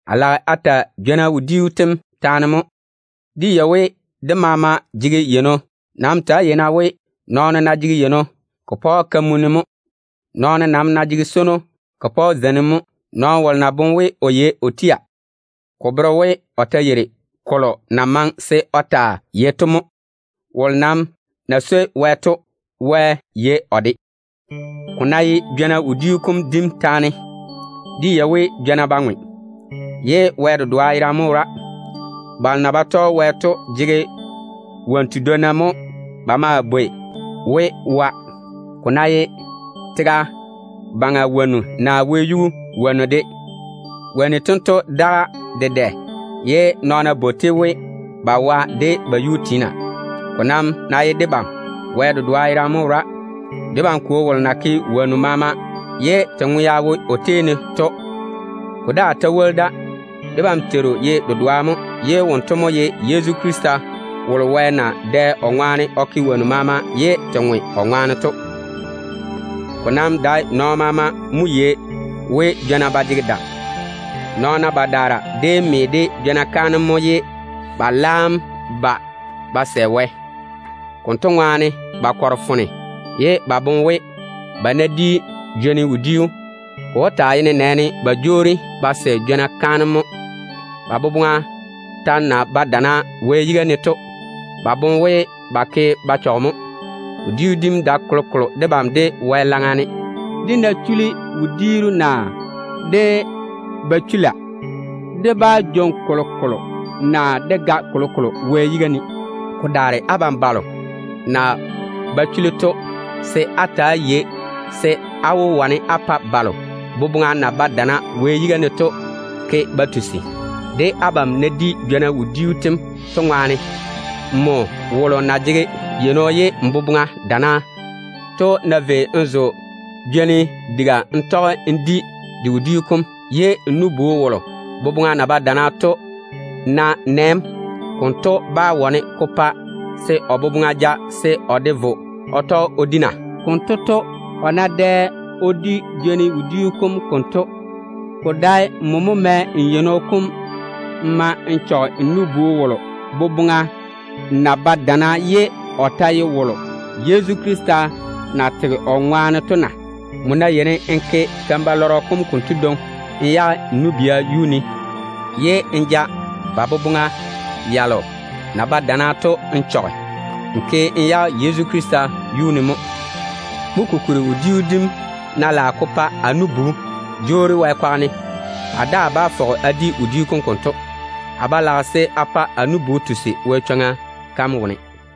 A lage a ta jwona wodiiru taane mo. Dé yei we, dé maama jege yeino. Nam ta‑á yei-na we, nɔɔno ná jege yeino, ko pa‑o kamunni mo. Nɔɔno nam ná jege swono, ko pae zeinim mo. Nɔɔno wolo ná boŋe we o yei o tia, ko bere we o ta yeiri kolo na maŋe se o taa yei to mo. Wolo nam na swoi Wɛ to, Wɛ yei o de. Ko ná ye jwona wodiu kom dim taane dem, dé yei we jwona ba ŋwe, ye Wɛ dedoa yerane mo wora. Nabiina jege wonnu tedwonna mo ba maa bwoi we ‘wa’, ko ná ye tega baŋa wonnu naa wɛyuu wonnu de. Wonnu tento daga dedɛ ye nɔɔna bwoi-te we, ba wa de ba yuu tiina. Ko nam ná ye debam, Wɛ dedoa yerane mo wora. Debam Kwo wom na ke woŋo maama ye dé ŋwea wo o tei ne to mo konto. Ko daa ta woli da, debam Teiru ye dedoa mo, ye wonto mo ye Yezu Krista. Wɛ na dɛ wolo ŋwaane o ke woŋo maama ye dé ŋwe o ŋwaane to mo wonto. Ko nam dae nɔɔno maama mo yei we jwona ba jege dam. Nɔɔna badaara déem me de jwona kaanem mo, ye ba laam ba ba sɛ Wɛ. Konto ŋwaane ba kɔre foone ye ba boŋe we, ba ná di jwoni wodiu, ko wó taa ye nenɛɛne ba jwoori ba sɛ jwona kaanem mo. Ba boboŋa ta na wo kweere Wɛ seeni to, ba boŋe we ba ke ba chɔge mo. Wodiu dim dae kolokolo debam de Wɛ laŋa ne. Dé ná chuli wodiiru naa dé ba chula, dé bá jwoŋi kolokolo naa dé ga kolokolo Wɛ yiga ne. Ko daare abam balo na ba chuli wodiu dim to, se á ta‑á yei se á wó wane á pa balo boboŋa na wo kweere Wɛ seeni to ke ba tusi, de abam na di jwona wodiiru tem to ŋwaane. Nmo wolo na jege yeino ye n boboŋa kweere to ná vei n zo jwoni diga n tɔge n di de wodiu kom, ye n nu-bu wolo boboŋa ta na wo kweere to ná nɛ‑m, konto bá wane ko pa se o boboŋa ja se o de vo o tɔge o di na? Konto to, o ná dɛ o di jwoni wodiu kom konto, ko dae nmo mo mɛ n yeino kom n ma n chɔge n nu-bu wolo boboŋa na wo kweere ye o ta ye wolo Yezu Krista na tega o ŋwaane to na? Nmo ná yeini n ke keim-balɔrɔ kom konto dwoŋi n chɔge n nu-bia wo, ye n ja ba boboŋa yalo na wo kweere to n chɔge, n ke tusim n chɔge Yezu Krista yiga mo. Mo kokuri, wodiu dim ná lage ko pa amo nu-bu tusi, a daa bá fɔge a do nɔna. a do nɔna naa a di wodiu kom konto A ba lage se a pa a nu-bu ywori Wɛ chwoŋa kam wone.